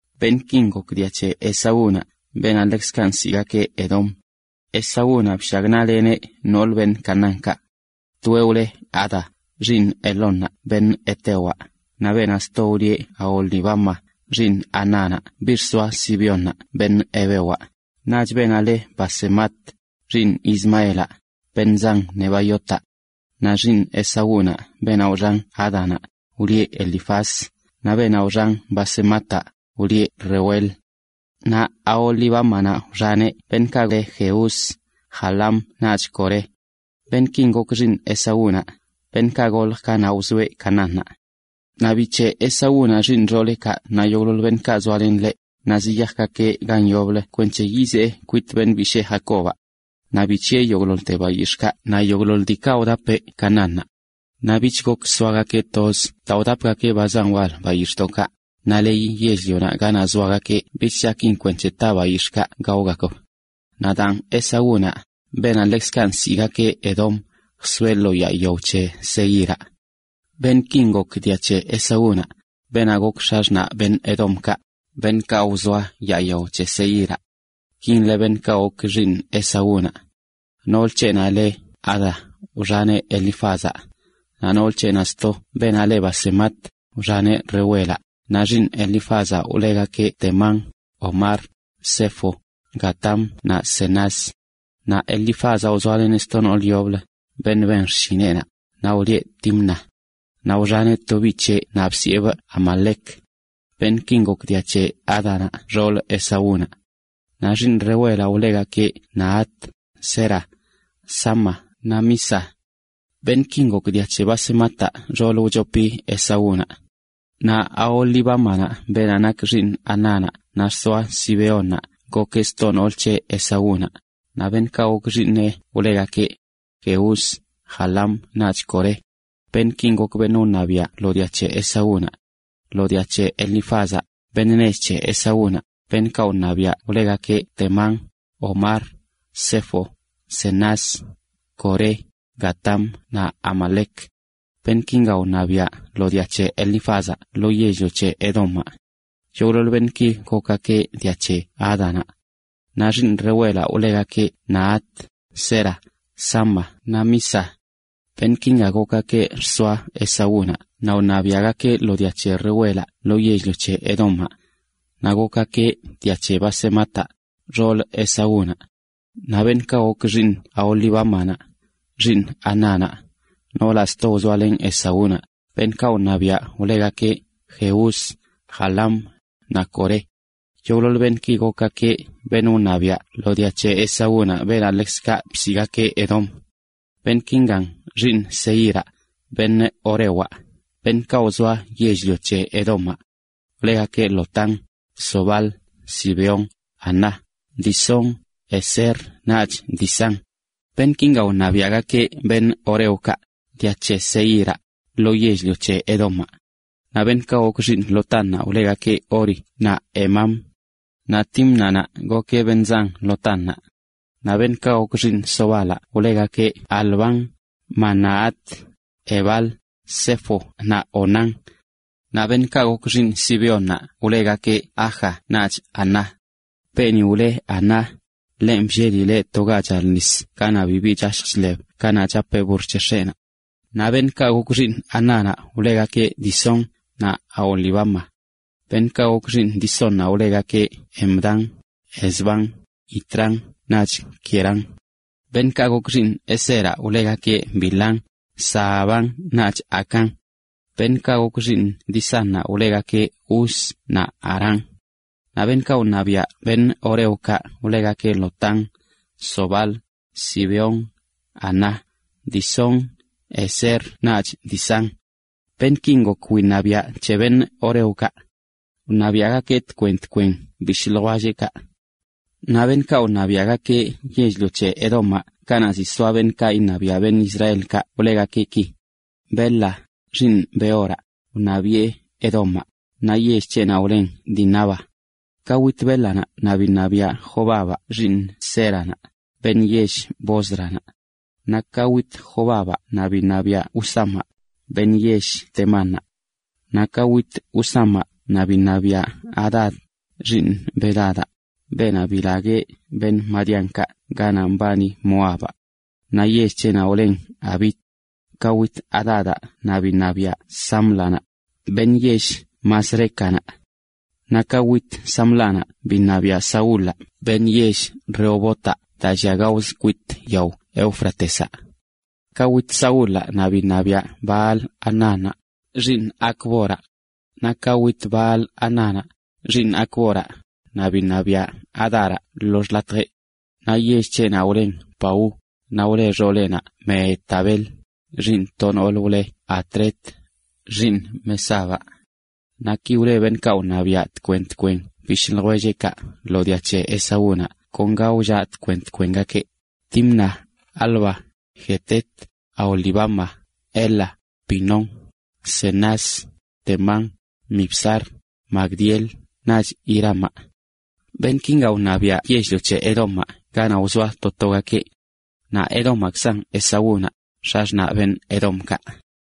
Beṉꞌkin gok dia c̱he Esaúnaꞌ, beenaꞌ ḻekzkaꞌ nsiꞌgakeꞌ Edom. Esaúnaꞌ bshagnaꞌleneꞌ noolə, beṉꞌ Canaánkaꞌ. Toeꞌ wleꞌ Ada, xiiṉ Elónnaꞌ beṉꞌ hetewaꞌ, naꞌ beenaꞌ sto lieꞌ Aholibama, xiiṉ Anánaꞌ biꞌ xsoaꞌ Zibeónaꞌ beṉꞌ hevewaꞌ, naꞌch beenaꞌ leꞌ Basemat, xiiṉ Ismaelaꞌ, beṉꞌ zan Nebaiotaꞌ. Naꞌ xiiṉ Esaúnaꞌ beenaꞌ wxan Ádanaꞌ, wlieꞌ Elifaz; naꞌ beenaꞌ wxan Basemataꞌ, wlieꞌ Reuel. Naꞌ Aholibámanaꞌ wxaneꞌ beṉꞌkaꞌ le Jeús, Jaalam naꞌch Coré. Beṉꞌkin gok xiiṉ Esaúnaꞌ, beṉꞌkaꞌ goljə kanaꞌ wzoeꞌ Canaánnaꞌ. Naꞌ bic̱heꞌ Esaúnaꞌ xiiṉ xooleꞌkaꞌ naꞌ yogꞌḻoḻ beṉꞌkaꞌ zoalen ḻeꞌ, naꞌ ziyajgakeꞌ gan yoblə kwenc̱he yizee kwit beṉꞌ bishee Jacobaꞌ. Naꞌ bic̱hiꞌe yogꞌḻoḻte bayix̱ꞌkaꞌ naꞌ yogꞌḻoḻ diikaꞌ wdapeꞌ Canaánnaꞌ. Naꞌ bich gok zoagakeꞌ toz daa wdapgakeꞌ ba zan wal bayix̱ꞌkaꞌ naꞌ leyi yell-lionaꞌ ganaꞌ zoagakeꞌ bich chakin ta bayix̱ꞌkaꞌ gaogakb. Naꞌ daan, Esaúnaꞌ, beenaꞌ ḻekzkaꞌ nsiꞌgakeꞌ Edom, jsoeꞌ lo yaa yao c̱he Seíraꞌ. Beṉꞌkin gok dia c̱he Esaúnaꞌ, beenaꞌ gok x̱axṉaꞌ beṉꞌ Edomkaꞌ, beṉꞌkaꞌ wzoa yaa yao c̱he Seíraꞌ. Kin le beṉꞌkaꞌ gok xiiṉ Esaúnaꞌ: noolə c̱heꞌnaꞌ le Ada wxaneꞌ Elifázaꞌ, naꞌ nool c̱heꞌnaꞌ sto beenaꞌ le Basemat, wxaneꞌ Reuelaꞌ. Naꞌ xiiṉ Elifázaꞌ wlegakeꞌ Temán, Omar, Zefo, Gatam naꞌ Cenaz. Naꞌ Elifázaꞌ wzoaleneꞌ sto noolə yoblə, beṉꞌ ben xshineꞌnaꞌ, naꞌ wlieꞌ Timna. Naꞌ wxaneꞌ to biꞌ c̱heꞌ naꞌ bsiꞌebꞌ Amalec. Beṉꞌkin gok dia c̱he Ádanaꞌ, xoolə Esaúnaꞌ. Naꞌ xiiṉ Reuelaꞌ wlegakeꞌ Nahat, Zera, Sama naꞌ Miza. Beṉꞌkin gok dia c̱he Basemataꞌ, xoolə wchopi Esaúnaꞌ. Naꞌ Aholibámanaꞌ beenaꞌ nak xiiṉ Anánaꞌ naꞌ xsoaꞌ Zibeónnaꞌ gokeꞌ sto noolə c̱he Esaúnaꞌ, naꞌ beṉꞌkaꞌ gok xiiṉeꞌ wlegakeꞌ: Jeús, Jaalam naꞌch Coré. Beṉꞌkin gok beṉꞌ wṉabiaꞌ lo dia c̱he Esaúnaꞌ: Lo dia c̱he Elifázaꞌ, beṉꞌ nech c̱he Esaúnaꞌ, beṉꞌkaꞌ wṉabiaꞌ wlegakeꞌ Temán, Omar, Zefo, Cenaz, Coré, Gatam naꞌ Amalec. Beṉꞌkinga wṉabiaꞌ lo dia c̱he Elifázaꞌ lo yell-lio c̱he Edomaꞌ. Yogꞌḻoḻ beṉꞌki gokgakeꞌ dia c̱he Ádanaꞌ. Naꞌ xiiṉ Reuelaꞌ, wlegakeꞌ Nahat, Zera, Sama naꞌ Miza. Beṉꞌkinga gokgakeꞌ xsoa Esaúnaꞌ naꞌ wṉabiagakeꞌ lo dia c̱he Reuelaꞌ lo yell-lio c̱he Edomaꞌ. Naꞌ gokgakeꞌ dia c̱he Basemataꞌ, xoolə Esaúnaꞌ. Naꞌ beṉꞌkaꞌ gok xiiṉ Aholibámanaꞌ, xiiṉ Anánaꞌ, noolaꞌ sto wzoalen Esaúnaꞌ, beṉꞌkaꞌ wṉabiaꞌ, wlegakeꞌ Jeús, Jaalam, naꞌ Coré. Yogꞌḻoḻ beṉꞌki gokgakeꞌ beṉꞌ wṉabiaꞌ lo dia c̱he Esaúnaꞌ, beenaꞌ ḻekzkaꞌ bsiꞌgakeꞌ Edom. Beṉꞌkin xiiṉ Seíraꞌ, beṉꞌ horewaꞌ, beṉꞌkaꞌ wzoa yell-lio c̱he Edomaꞌ, wlegakeꞌ: Lotán, Sobal, Zibeón, Aná, Disón, Ezer naꞌch Disán. Beṉꞌkinga wṉabiaꞌgakeꞌ horeokaꞌ, dia c̱he Seíraꞌ, lo yell-lio c̱he Edomaꞌ. Naꞌ beṉꞌkaꞌ gok xiiṉ Lotánnaꞌ wlegakeꞌ Hori naꞌ Hemam. Naꞌ Tímnanaꞌ gokeꞌ beṉꞌ zan Lotánnaꞌ. Naꞌ beṉꞌkaꞌ gok xiiṉ Sobalaꞌ wlegakeꞌ Alván, Manahat, Ebal, Sefo naꞌ Onam. Naꞌ beṉꞌkaꞌ gok xiiṉ Zibeónnaꞌ wlegakeꞌ Aja naꞌch Aná. Beeni wle Aná, ḻenꞌ bllelileꞌ to ga chal nis ganaꞌ bibi chashj chḻeb kanaꞌ chapeꞌ burr c̱he x̱eꞌnaꞌ. Naꞌ beṉꞌkaꞌ gok xiiṉ Anánaꞌ wlegakeꞌ Disón, naꞌ Aholibama. Beṉꞌkaꞌ gok xiiṉ Disónnaꞌ wlegakeꞌ Hemdán, Esbán, Itrán naꞌch Querán. Beṉꞌkaꞌ gok xiiṉ Ezeraꞌ wlegakeꞌ Bilhán, Zaaván naꞌch Acán. Beṉꞌkaꞌ gok xiiṉ Disánnaꞌ wlegake Uz naꞌ Arán. Naꞌ beṉꞌkaꞌ wṉabiaꞌ horeokaꞌ wlegakeꞌ Lotán, Sobal, Zibeón, Aná, Disón, Ezer naꞌch Disán. Beṉꞌkin gok wiṉabiaꞌ c̱he horeokaꞌ. Wṉabiaꞌgakeꞌ tkwen tkwen bishꞌ ljwellgakeꞌ. Naꞌ beṉꞌkaꞌ wṉabiaꞌgakeꞌ yell-lio c̱he Edomaꞌ kanaꞌ ziꞌ soa beṉꞌkaꞌ []iṉabiaꞌ beṉꞌ Israelkaꞌ wlegakeꞌ ki: Bela, xiiṉ Beoraꞌ, wṉabiꞌe Edomaꞌ, naꞌ yell c̱heꞌnaꞌ wlen Dinaba. Ka wit Bélanaꞌ naꞌ biṉabiaꞌ Jobabaꞌ, xiiṉ Zéranaꞌ, beṉꞌ yell Bósranaꞌ. Naꞌ ka wit Jobabaꞌ naꞌ biṉabiaꞌ Husamaꞌ, beṉꞌ yell Temánnaꞌ. Naꞌ ka wit Husamaꞌ naꞌ biṉabiaꞌ Hadad, xiiṉ Bedadaꞌ, beenaꞌ bilagueꞌ madianitakaꞌ ganaꞌ mbani Moabaꞌ. Naꞌ yell c̱heꞌnaꞌ wlen Avit. Ka wit Hadadaꞌ naꞌ biṉabiaꞌ Sámlanaꞌ, beṉꞌ yell Masrécanaꞌ. Naꞌ ka wit Sámlanaꞌ biṉabiaꞌ Saúlaꞌ, beṉꞌ yell Rehobotaꞌ daa llia gaozə kwit yao Éufratezaꞌ. Ka wit Saúlaꞌ naꞌ biṉabiaꞌ Baal-hanánnaꞌ, xiiṉ Acboraꞌ. Naꞌ ka wit Baal-hanánnaꞌ, xiiṉ Acboraꞌ, naꞌ biṉabiaꞌ Hadaraꞌ lo xḻatjeꞌ. Naꞌ yell c̱heꞌnaꞌ wlen Pau, naꞌ wle xooleꞌnaꞌ Mehetabel, xiiṉ to nool wleꞌ Matred, xiiṉ Mezaabaꞌ. Naꞌ ki wle beṉꞌkaꞌ wṉabiaꞌ tkwen tkwen bishꞌ ljwelleꞌkaꞌ lo dia c̱he Esaúnaꞌ kon ga wllaꞌ tkwen tkwengakeꞌ: Timna, Alva, Jetet, Aholibama, Ela, Pinón, Cenaz, Temán, Mibzar, Magdiel naꞌch Iramaꞌ. Beṉꞌkin wṉabiaꞌ yell-lio c̱he Edomaꞌ ganaꞌ wzoa to togakeꞌ. Naꞌ Edomaꞌkzan Esaúnaꞌ, x̱axṉaꞌ beṉꞌ Edomkaꞌ.